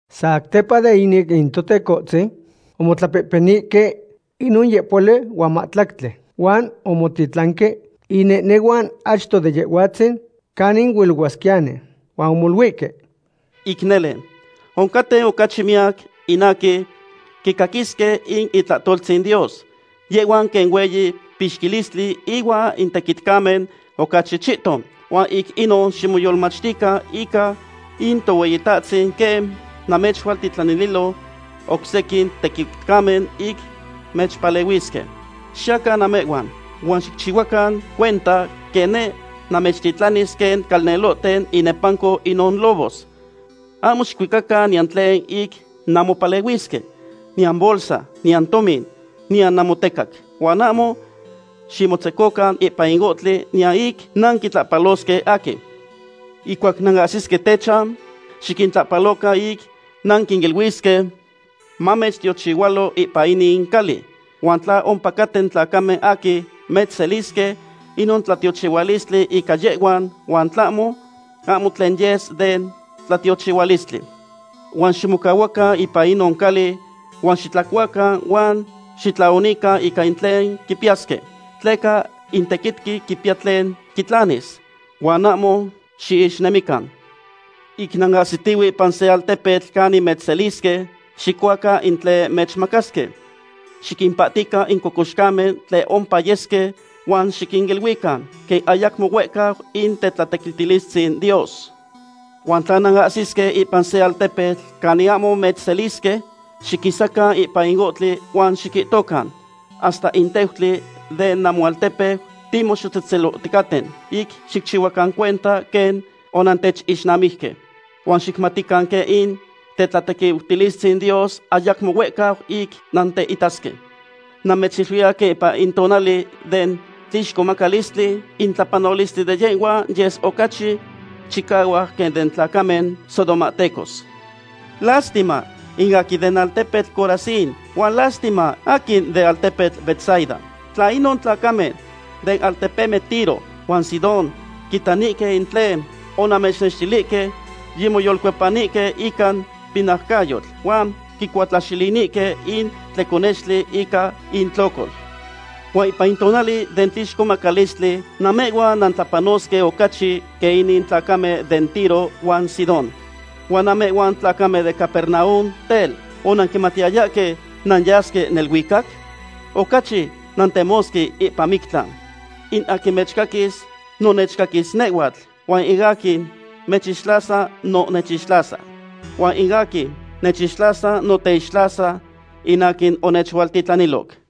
Satepa de inin in Totecohtzin omotlapehpenihque inon yehpohuali huan mahtlactli, huan omotitlanque inehnehuan achto de Yehhuatzin, canin huilohuasquiyani. Huan omoluihque: ―Ic nele, oncaten ocachi miyac in aquin quicaquisque in itlahtoltzin Dios. Yehhuan quen hueyi pixquistli huan in tequitcamen ocachi chihton. Huan ic inon ximoyolmachtican ica in Tohueyitahtzin quen mamechualtitlanililo oc sequin tequitcamen ic mechpalehuisque. Xiyacan namehhuan, huan xicchihuacan cuenta quen neh namechtitlanis quen calnelohten inepanco inon lobos. Ahmo xicuicacan niyan tlen ic nanmopalehuisque, niyan bolsa, niyan tomin, niyan namotecac. Huan ahmo ximotzecocan ipan in ohtli niyan ic nanquitlahpalosque aquin. Ihcuac nanahsisque techan, xiquintlahpalocan ic nanquiniluisque: “Mamechtiochihualo ipan inin cali.” Huan tla ompacaten tlacamen aquin mechselisque, inon tlatiochihualistli ica yehhuan, huan tlahmo, ahmo tlen yes den tlatiochihualistli. Huan ximocahuacan ipan inon cali huan xitlacuacan huan xitlaonican ica in tlen quipiyasque, tleca in tequitqui quipiya tlen quitlanis. Huan ahmo xiixnemican. Ic nanahsitihue ipan se altepetl canin mechselisque, xicuacan in tlen mechmacasque. Xiquimpahtican in cocoxcamen tlen ompa yesque huan xiquiniluican: “Quen ayacmo huehcau in tetlatequiutilistzin Dios.” Huan tla nanahsisque ipan se altepetl canin ahmo mechselisque, xiquisacan ipan in ohtli huan xiquihtocan: “Hasta in teutli den namoaltepeu timoxohtzetzelohticaten, ic xicchihuacan cuenta quen onantechixnamijque. Huan xicmatican quen in tetlatequiutilistzin Dios ayacmo huehcau ic nanteitasque.” Namechiluiya quen ipan in tonali den tlixcomacalistli, in tlapanolistli den yehhuan yes ocachi chicahuac quen den tlacamen sodomahtecos. ’Lástima in aquin den altepetl Corazín huan lástima aquin den altepetl Betsaida. Tla inon tlacamen den altepemen Tiro huan Sidón quitanihque in tlen onamechnextilihque, yimoyolcuepanihque ica pinaucayotl, huan quincuatlaxilinihque in tleconextli ica intlocol. Huan ipan in tonali den tlixcomacalistli namehhuan nantlapanosque ocachi quen in tlacamen den Tiro huan Sidón. Huan namehhuan tlacamen den Capernaum, tel, ¿onanquimatiyayahque nanyasque neluicac? Ocachi nantemosque ipan mictlan. ’In aquin mechcaquis, no nechcaquis nehhuatl, huan in aquin mechixtlasa no nechixtlasa. Huan in aquin nechixtlasa no teixtlasa in aquin onechualtitlaniloc.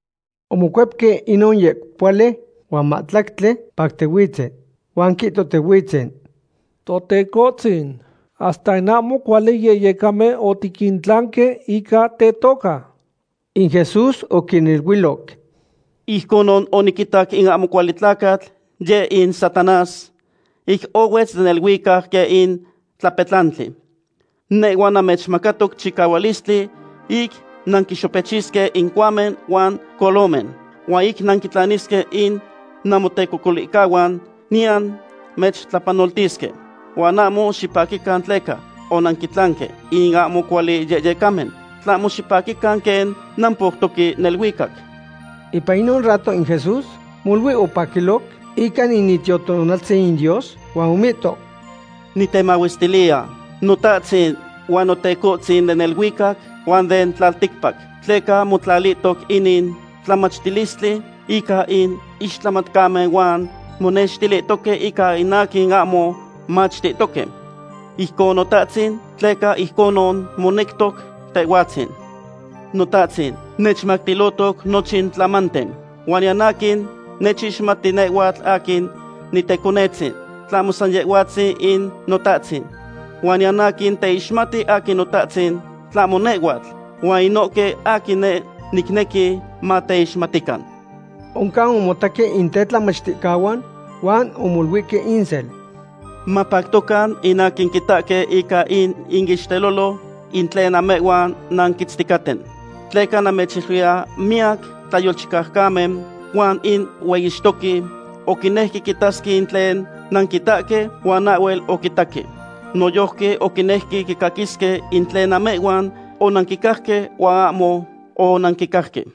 Omocuepque inon yehpohuali huan mahtlactli pactihuitzen. Huan quihtohtihuitzen: ―¡Totecohtzin, hasta in ahmo cuali yehyecamen otiquintlanque ica tetoca! In Jesús oquiniluiloc: ―Ijconon oniquitac in ahmo cuali tlacatl, yeh in Satanás, ic ohuetz den neluicac quen in tlapetlantli. Nehhua namechmacatoc chicahualistli ic nanquinxopechisque in cohuamen huan colomen, huan ic nanquitlanisque in namotecocolihcahuan, niyan mechtlapanoltisque. Huan ahmo xipaquican tleca onanquintlanque in ahmo cuali yehyecamen, tlahmo xipaquican quen nampoutoque neluicac. Ipan inon rato in Jesús molui opaquiloc ica in Itiotonaltzin in Dios, huan omihto: ―Nitemahuestiliya, Notahtzin huan Notecohtzin den neluicac huan den tlalticpac, tleca motlatihtoc inin tlamatilistli ica in ixtlamatcamen huan monextilihtoque ica in aquin ahmo machtihtoque. Ijcon Notahtzin, tleca ijconon monectoc Tehhuatzin. ’Notahtzin nechmactilohtoc nochin tlamanten. Huan niyan aquin nechixmati nehhuatl aquin Niteconetzin, tlahmo san Yehhuatzin in Notahtzin. Huan niyan aquin teixmati aquin Notahtzin tlahmo nehhuatl, huan inohque aquin neh nicnequi mateixmatican. Oncan omotaqui in tetlamachticahuan huan omoluihque insel: ―Mapactocan in aquin quitahque ica in iixtelolo in tlen namehhuan nanquitzticaten. Tleca namechiluiya miyac tlayolchicaucamen huan in hueyixtoqui oquinejque quitasque in tlen nanquitahque, huan ahhuel oquitaque. Noyojqui oquinejque quicaquisque in tlen namehhuan onanquicajque huan ahmo onanquicajque.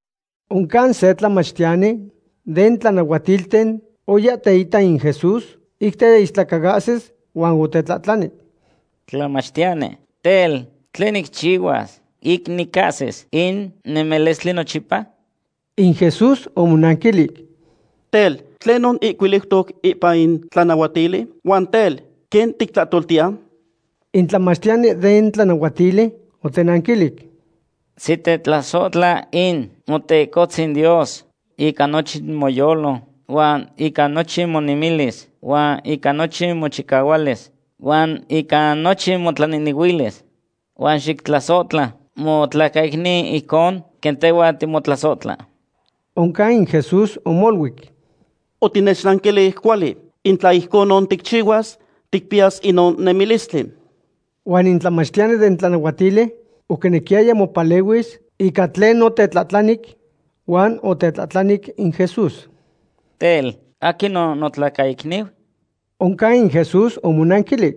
Oncan se tlamachtiyani den tlanahuatilten oya teita in Jesús ic teistlacaahsis huan otetlahtlani: ―Tlamachtiyani, tel, ¿tlen nicchihuas ic nicahsis in nemilistli nochipa? In Jesús omonanquilic: ―Tel, ¿tlenon ihcuiliutoc ipan in tlanahuatili? Huan tel, ¿quen tictlahtoltiya? In tlamachtiyani den tlanahuatili otenanquilic: ―Xitetlasohtla in Motecohtzin Dios ica nochin moyolo, huan ica nochin monemilis, huan ica nochin mochicahualis, huan ica nochin motlanehnehuilis. Huan xictlasohtla motlacaicniu ijcon quen tehhua timotlasohtla. Oncan in Jesús omoluic: ―Otinechnanquilic cuali. In tla ijconon ticchihuas, ticpiyas inon nemilistli. Huan in tlamachtiyani den tlanahuatili oquinequiyaya mopalehuis ica tlen otetlahtlanic, huan otetlahtlanic in Jesús: ―Tel, ¿aquinon notlacaicniu? Oncan in Jesús omonanquilic: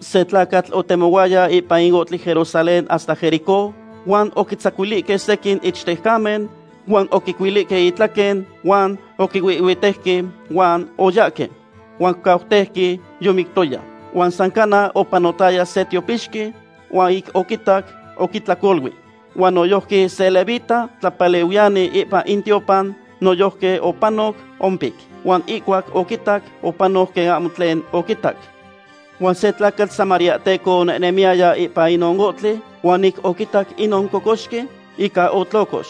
―Se tlacatl otemohuaya ipan in ohtli Jerusalén hasta Jericó, huan oquitzacuilihque sequin ichtejcamen huan oquicuilihque itlaquen huan oquihuihhuitejque huan oyahque. Huan oquicauteuque yomictoya. Huan san cana, opanotaya se tiopixqui, huan ic oquitac, oquitlacolui. Huan noyojqui se levita, tlapalehuiyani ipan in tiopan, noyojqui opanoc ompic. Huan ihcuac oquitac, opanoc quen ahmo tlen oquitac. Huan se tlacatl samariahteco onehnemiyaya ipan inon ohtli, huan ic oquitac inon cocoxqui, ica otlocox.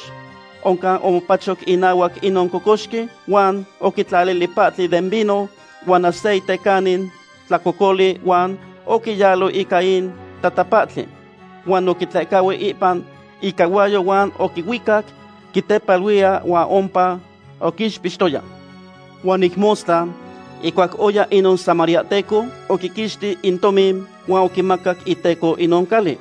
Oncan omopacho inahuac inon cocoxqui, huan oquitlalili pahtli den vino huan aceite canin tlacocoli huan oquiyalo ica in tatapahtli. Huan oquitlehcahui ipan icahuayo huan oquihuicac quitepaluiya huan ompa oquixpixtoya. Huan ic mostla, ihcuac oya inon samariahteco, oquiquixti in tomin huan oquimacac iteco inon cali.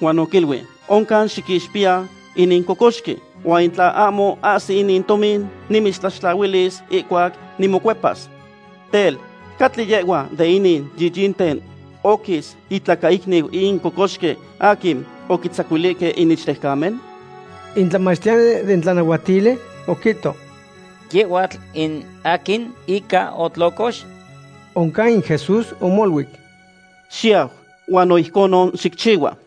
Huan oquiluic: “Oncan xiquixpiya inin cocoxqui, huan tla ahmo ahsis inin tomin, nimitztlaxtlahuilis ihcuac nimocuepas.” Tel, ¿catli yehhua de inin yiyinten oquis itlacaicniu in cocoxqui aquin oquitzacuilihque in ichtejcamen? In tlamachtiyani den tlanahuatili oquihto: ―Yehhuatl in aquin ica otlocox. Oncan in Jesús omoluic: ―Xiyau, huan no ijconon xicchihua.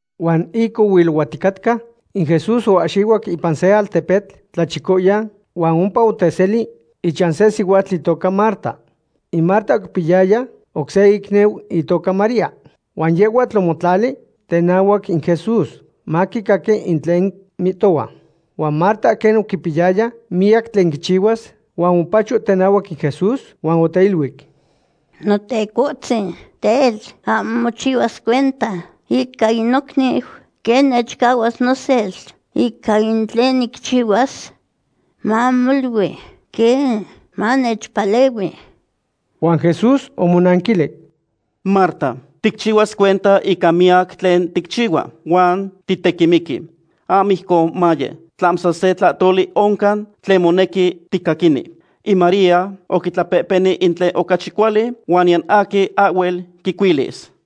Huan ic ohuilohuaticatca, in Jesús oahxihuac ipan se altepetl tlachicoyan, huan ompa oteseli ichan se sihuatl itoca Marta. In Marta oquipiyaya oc se icniu itoca María, huan yehhuatl omotlali tenahuac in Jesús maquicaqui in tlen mihtohua. Huan Marta quen oquipiyaya miyac tlen quichihuas huan omopacho tenahuac in Jesús huan oteiluic: ―Notecohtzin, tel, ¿ahmo mochihuas cuenta ica in nocniu, quen nechcahuas nosel ica in tlen nicchihuas? Mamolui quen manechpalehui. Huan Jesús omonanquilic: ―Marta, ticchihuas cuenta ica miyac tlen ticchihua, huan titequimiqui. Ahmo ijcon maye. Tlahmo san se tlahtoli oncan tlen monequi ticaquini. In María oquitlapehpeni in tlen ocachi cuali huan niyan aquin ahhuel quicuilis.